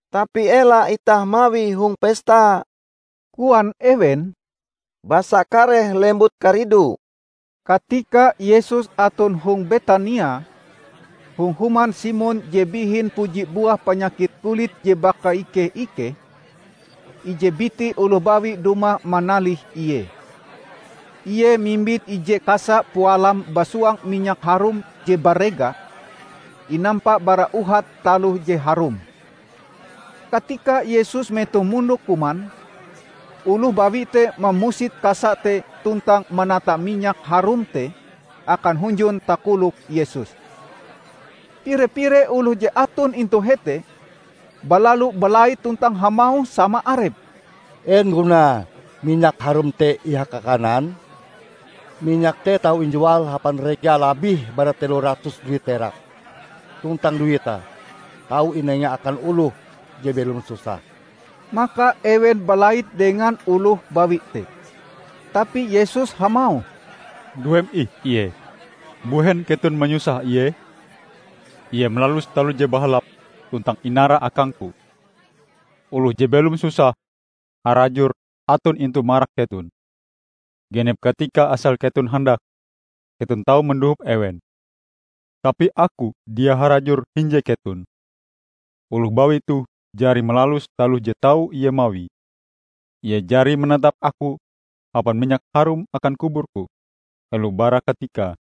"Tapi ela itah mawie hong pesta," koan ewen, "basa kareh lembut karidu." Katika Yesus aton hong Betania, hong human Simon je bihin puji buah panyakit kulit je bakaike-ikeh, ije biti oloh bawi dumah manalih Ie. Ie mimbit ije kasa pualam basuang minyak harum je barega, inampa bara uhat taloh je harum. Katika Yesus metoh mondok kuman, oloh bawi te mamusit kasa te tuntang manata minyak harum te akan hunjun takolok Yesus. Pire-pire oloh je aton intu hete balalu balait tuntang hamauh sama arepe, "En gunae minyak harum te ihaka-kanan? Minyak te tau injual hapan rega labih bara telo ratus duit perak, tuntang duite tau inenga akan oloh je belom susah!" Maka ewen balait dengan oloh bawi te. Tapi Yesus hamauh, "Nduem ih ie! Mbuhen keton manyusah ie? Ie malalus taloh je bahalap tuntang inara akang-Ku. Oloh je belom susah harajur aton intu marak keton. Genep katika asal keton handak, keton tau mandohop ewen. Tapi Aku dia harajur hinje keton. Oloh bawi toh jari malalus taloh je tau ie mawie. Ie jari manatap Aku hapan minyak harum akan kubur-Ku helo bara katikae.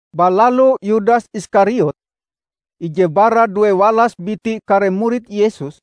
Balalu Yudas Iskariot, ije bara duewalas biti kare murid Yesus,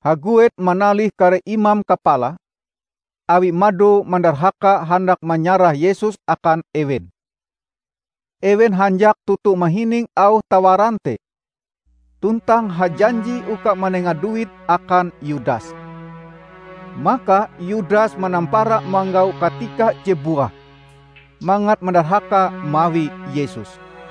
haguet manalih kare imam kapala awie mado mandarhaka handak manyarah Yesus akan ewen. Ewen hanjak toto mahining auh tawaran te tuntang hajanji uka manenga duit akan Yudas. Maka Yudas manampara manggau katika je buah mangat mandarhaka mawi Yesus.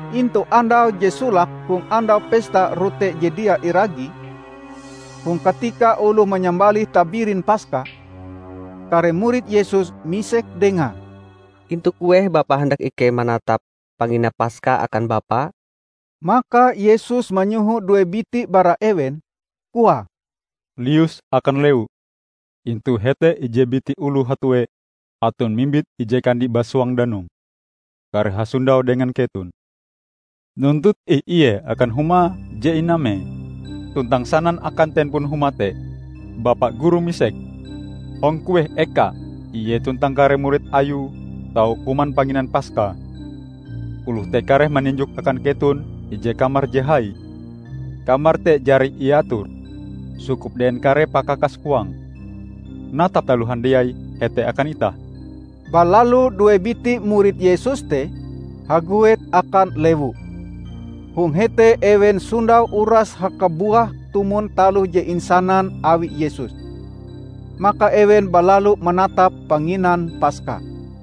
Intu andau je solake hong Andau Pesta Rote Je Dia Iragi -- hong katika oloh manyambalih tabirin Paska -- kare murid Yesus misek dengae, "Intu kueh Bapa handak ikei manatap panginan Paska akan Bapa?" Maka Yesus manyoho due biti bara ewen, koae, "Lius akan lewu, intu hete ije biti oloh hatue aton mimbit ije kandi basuang danum, kareh hasondau dengan keton. Nuntut ih ie akan huma je inamee tuntang sanan akan Tempon huma te, 'Bapa Guru misek, hong kueh ekae Ie tuntang kare murid Ayue tau kuman panginan Paska.' Oloh te kareh maninjok akan keton ije kamar je hai. Kamar te jari iator, sukup dengan kare pakakas huange. Natap taloh handiai hete akan itah." Balalu due biti murid Yesus te haguet akan lewu. Hong hete ewen sondau uras hakabuah tumon taloh je insanan awi Yesus. Maka ewen balalu manatap panginan Paska.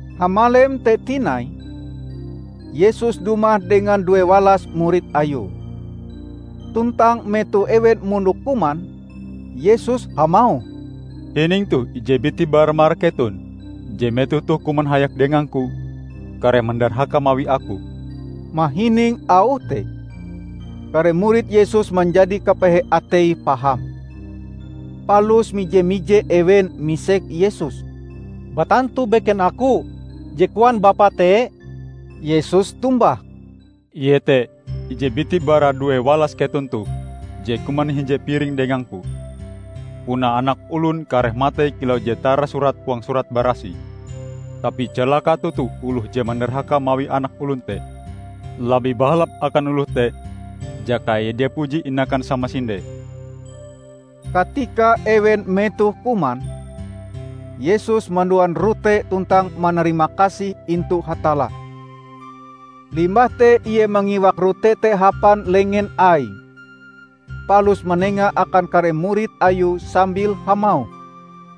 Hamalem te tinai, Yesus dumah dengan duewalas murid Ayue. Tuntang metoh ewen mondok kuman, Yesus hamauh, "Hining toh: ije biti bara marak keton, je metoh toh kuman hayak dengang-Ku kareh mandarhaka mawi Aku." Mahining auh te, kare murid Yesus manjadi kapehe ateie paham. Palus mije-mije ewen misek Yesus, "Batantu beken aku je koan Bapa te?" Yesus tombah, "Ie te ije biti bara duewalas keton toh, je kuman hinje piringe dengang-Ku. Punae Anak Olon kareh matei kilau je tarasurat huang Surat Barasih. Tapi calaka toto oloh je mandarhaka mawi Anak Olon te! Labih bahalap akan oloh te jaka ie dia puji inakan samasinde!" Katika ewen metoh kuman, Yesus manduan rote tuntang manarimakasih intu Hatalla. Limbah te Ie mangiwak rote te hapan lengen Aie, palus manengae akan kare murid Ayue sambil hamauh,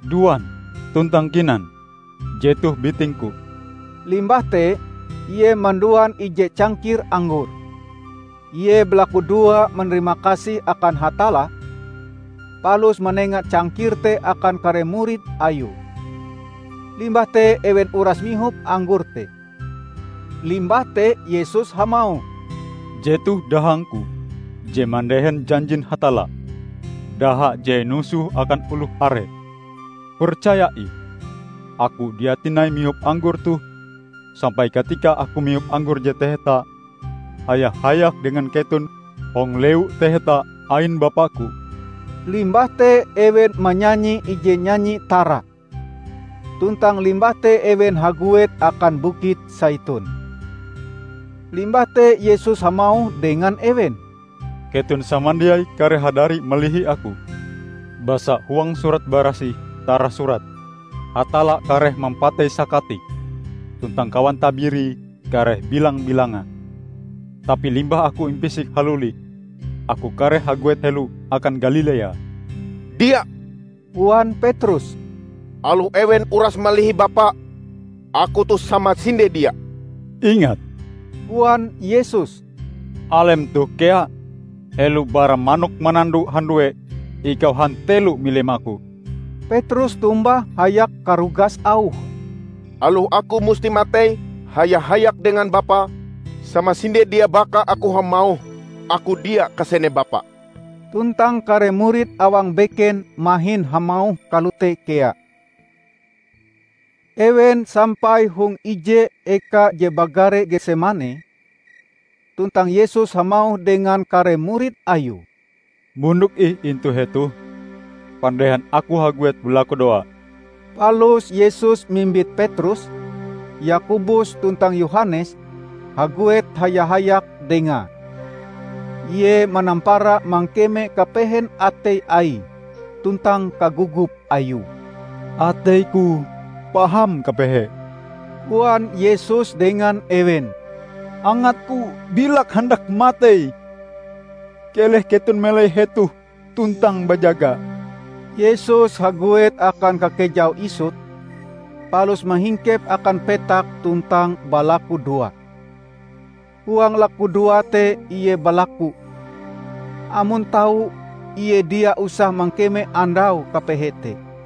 "Duan tuntang kinan, jetoh biting-Ku." Limbah te Ie manduan ije cangkir anggor. Ie balakudoa manarimakasih akan Hatalla, palus manenga cangkir te akan kare murid Ayue. Limbah te ewen uras mihop anggor te. Limbah te Yesus hamauh, "Jetoh dahang-Ku je mandehen janjin Hatalla, daha je inusoh akan oloh are. Percaya ih: Aku dia tinai mihop anggor toh, sampai katika Aku mihop anggor je taheta haya-hayak dengan keton hong Lewu Taheta ain Bapa-Ku." Limbah te ewen manyanyi ije nyanyi tara. Tuntang limbah te ewen haguet akan Bukit Saitun. Limbah te Yesus hamauh dengan ewen, "Keton samandiai kareh hadari malihi Aku. Basa huang Surat Barasih tarasurat, 'Hatalla kareh mampatei sakatike, tuntang kawan tabirie kareh bilang-bilanga.' Tapi limbah Aku impisik haluli, Aku kareh haguet helo akan Galilea." "Dia," koan Petrus, "aloh ewen uras malihi Bapa, aku toh samasinde dia." "Ingat," koan Yesus, "alem toh kea, helo bara manok manando handue, ikau hantelo milim aku." Petrus tombah hayak karugas auhe, "Aloh aku musti matei haya-hayak dengan Bapa, samasinde dia baka aku hamauh aku dia kasene Bapa!" Tuntang kare murid awang beken mahin hamauh kalote kea. Ewen sampai hong ije eka je bagare Getsemane, tuntang Yesus hamauh dengan kare murid Ayue, "Mondok ih intu hetoh pandehan aku haguet balakudoa." Palus Yesus mimbit Petrus, Yakobus tuntang Yohanes haguet haya-hayak Dengae. Ie manampara mangkeme kapehen atei Aie tuntang kagogop Ayue. "Atei-Ku paham kapehe," koan Yesus dengan ewen, "angat-Ku bilak handak matei. Keleh keton melai hetoh tuntang bajaga!" Yesus haguet akan kakejau isut palus mahingkep akan petak tuntang balakudoa. Huang lakudoae te Ie balaku amon tau Ie dia usah mangkeme andau kapehe te.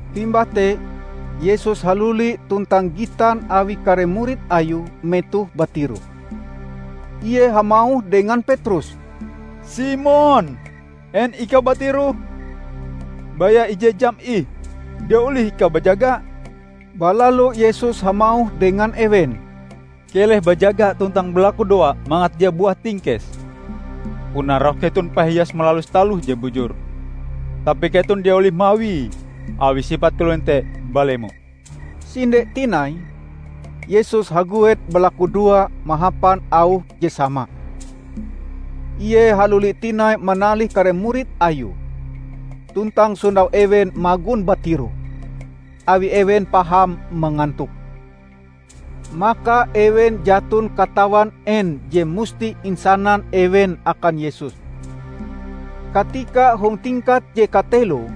Limbah te Yesus haluli tuntang gitan Awie kare murid Ayue metoh batiroh. Ie hamauh dengan Petrus, "Simon, en ikau batiroh? Baya ije jam ih, dia olih ikau bajaga?" Balalu Yesus hamauh dengan ewen, "Keleh bajaga tuntang balakudoa mangat dia buah tingkes. Puna roh keton pahias malalus taloh je bujur, tapi keton dia olih mawie awi sipat kalonen te balemo." Sinde tinai Yesus haguet balakudoa mahapan auh je sama. Ie haluli tinai manalih kare murid Ayue tuntang sondau ewen magon batiroh, awi ewen paham mangantok. Maka ewen jaton katawan en je musti insanan ewen akan Yesus. Katika hong tingkat je kateloe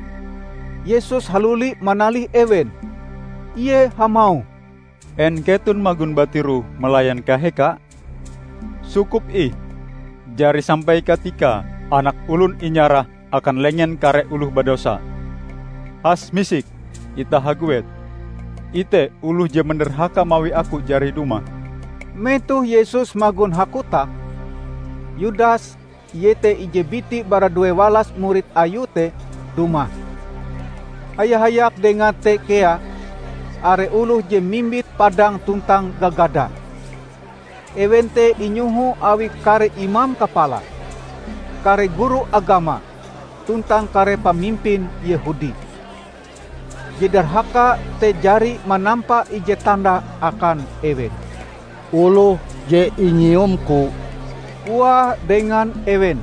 Yesus haluli manalih ewen, Ie hamauh, "En keton magon batiroh malayan kaheka? Sukup ih! Jari sampai katikae Anak Olon inyarah akan lengen kare oloh badosa. Has misik, itah haguet. Ite! Oloh je mandarhaka mawi Aku jari dumah!" Metoh Yesus magon hakotak, Yudas, iete ije biti bara duewalas murid Ayue te, dumah. Haya-hayak dengae te kea are oloh je mimbit padang tuntang gagada. Ewen te inyoho awi kare imam kapala, kare guru agama tuntang kare pamimpin Yehudi. Je darhaka te jari manampa ije tanda akan ewen. "Oloh je inyiumku," koae dengan ewen,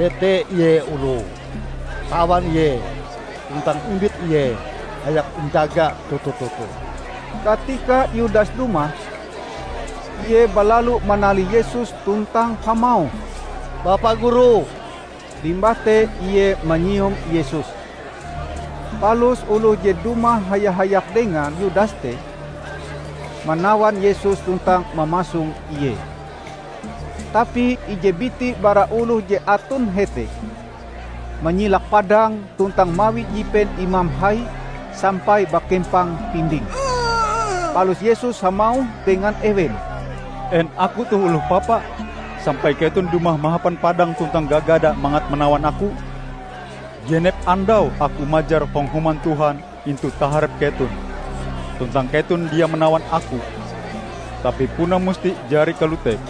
"jete Ie oloe. Tawan Ie tuntang imbit Ie hayak injaga toto-toto." Katika Yudas dumah, ie balalu manalih Yesus tuntang hamauh, "Bapa Guru!" limbah te ie manyium Yesus. Palus oloh je dumah haya-hayak dengan Yudas te manawan Yesus tuntang mamasong Ie. Tapi ije biti bara oloh je aton hete manyilak padange tuntang mawi jipen imam hai sampai bakempang pindinge. Palus Yesus hamauh dengan ewen, "En Aku toh oloh papa, sampai keton dumah mahapan padang tuntang gagada mangat manawan aku? Genep andau aku majar hong Human Tuhan intu taharep keton, tuntang keton dia manawan Aku. Tapi puna musti jari kalote,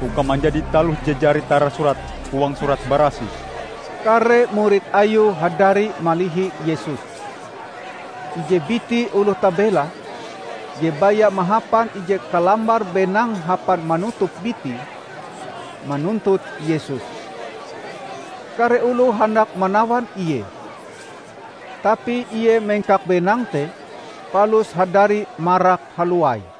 uka manjadi taloh je jari tarasurat huang Surat Barasih." Kare murid Ayue hadari malihi Yesus. Ije biti oloh tabela, je baya mahapan ije kalambar benang hapan manutup bitie, manuntut Yesus. Kare oloh handak manawan ie, tapi ie mengkak benang te, palus hadari marak halowai.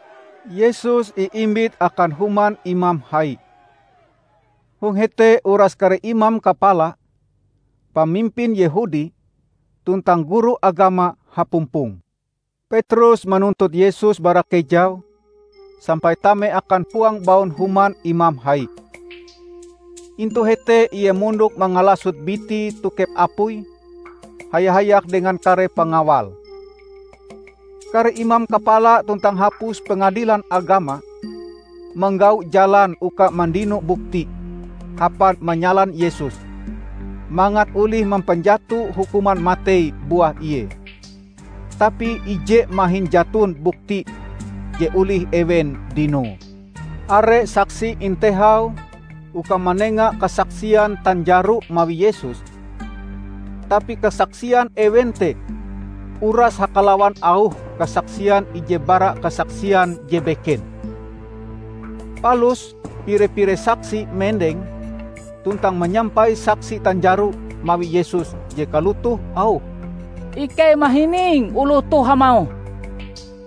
Yesus iimbit akan human imam hai. Hong hete uras kare imam kapala, pamimpin Yehudi, tuntang guru agama hapumpong. Petrus manuntut Yesus bara kejau sampai tame akan huang baun human imam hai. Intu hete ie mondok mangalasot bitie tokep apui haya-hayak dengan kare pengawal. Kare imam kapala tuntang hapus Pengadilan Agama manggau jalan uka mandino bukti hapan manyalan Yesus mangat olih mampanjato hukuman matei buah Ie. Tapi ije mahin jaton bukti je olih ewen dinoe. Are saksi intehau uka manenga kasaksian tanjaro mawi Yesus, tapi kasaksian ewen te uras hakalawan auhe kasaksian ije bara kasaksian je beken. Palus pire-pire saksi mendeng tuntang manyampai saksi tanjaro mawi Yesus je kalotoh auhe, "Ikei mahining oloh toh hamauh,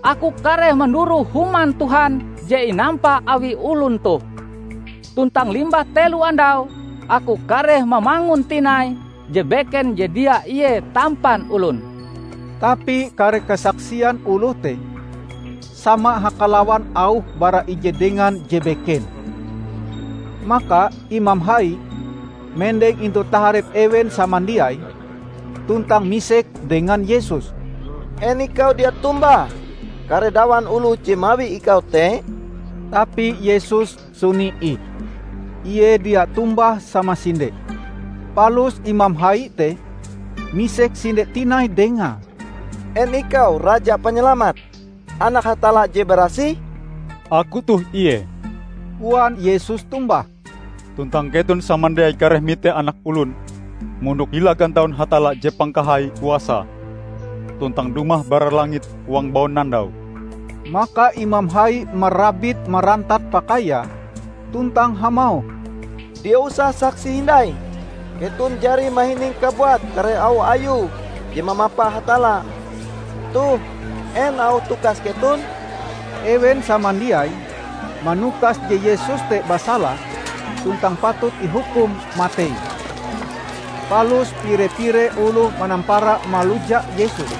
'Aku kareh manduroh Human Tuhan je inampa awi olon toh, tuntang limbah telo andau, aku kareh mamangun tinai je beken je dia ie tampan olon.' " Tapi kare kasaksian oloh te sama hakalawan auhe bara ije dengan je beken. Maka imam hai mendeng intu taharep ewen samandiai tuntang misek dengan Yesus, "En Ikau dia tombah kare dawan oloh je mawi Ikau te?" Tapi Yesus suni ih. Ie dia tombah samasinde. Palus imam hai te misek sinde tinai Dengae, "En ikau Raja Panyalamat, Anak Hatalla je Barasih?" "Aku toh ie," koan Yesus tombah, "tuntang keton samandiai kareh mite Anak Olon mondok hila gantaun Hatalla je Pangkahai Kuasae tuntang dumah bara langit huang baunandau!" Maka imam hai marabit-marantat pakaiae tuntang hamauh, "Dia usah saksi hindai! Keton jari mahining kabuat kare auh Ayue je mamapa Hatalla. Toh, en auh tukas keton?" Ewen samandiai manukas je Yesus te basala, tuntang patut ihukum matei. Palus pire-pire oloh manampara maluja Yesus,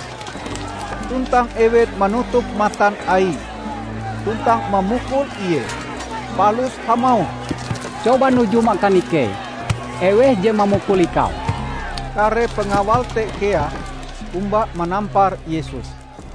tuntang ewen manutup matan Aie tuntang mamukul Ie, palus hamauh, "Coba nujum akan ikei eweh je mamukul Ikau?" Kare pengawal te kea omba manampar Yesus.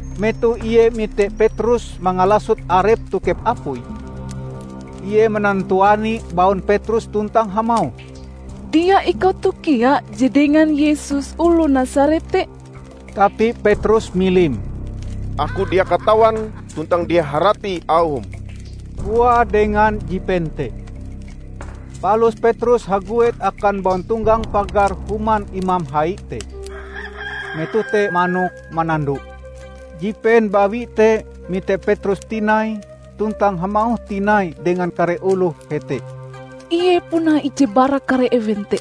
Metoh ie mite Petrus mangalasot arepe tokep apui, ie manantuani baun Petrus tuntang hamauh, "Dia ikau toh kea je dengan Yesus oloh Nasaret te?" Tapi Petrus milim. "Aku dia katawan tuntang dia harati auhm," koae dengan jipen te. Palus Petrus haguet akan bauntonggang pagar human imam hai te. [Metoh te manok manando.] Jipen bawi te mite Petrus tinai tuntang hamauh tinai dengan kare oloh hete. "Ie puna ije bara kare ewen te!"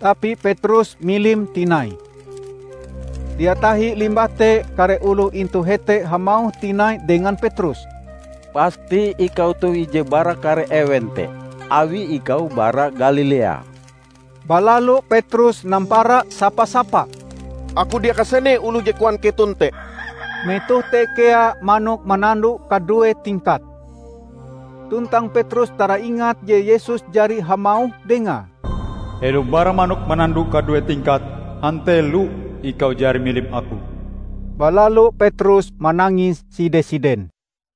Tapi Petrus milim tinai. Dia tahi limbah te kare oloh intu hete hamauh tinai dengan Petrus, "Pasti ikau toh ije bara kare ewen te, awi ikau bara Galilea!" Balalu Petrus nampara sapa-sapa, "Aku dia kasene oloh je koan keton te!" Metoh te kea manok manando kadue tingkate. Tuntang Petrus taraingat je Yesus jari hamauh dengae, "Helo bara manok manando kadue tingkate, hantelo ikau jari milim Aku." Balalu Petrus manangis side-siden.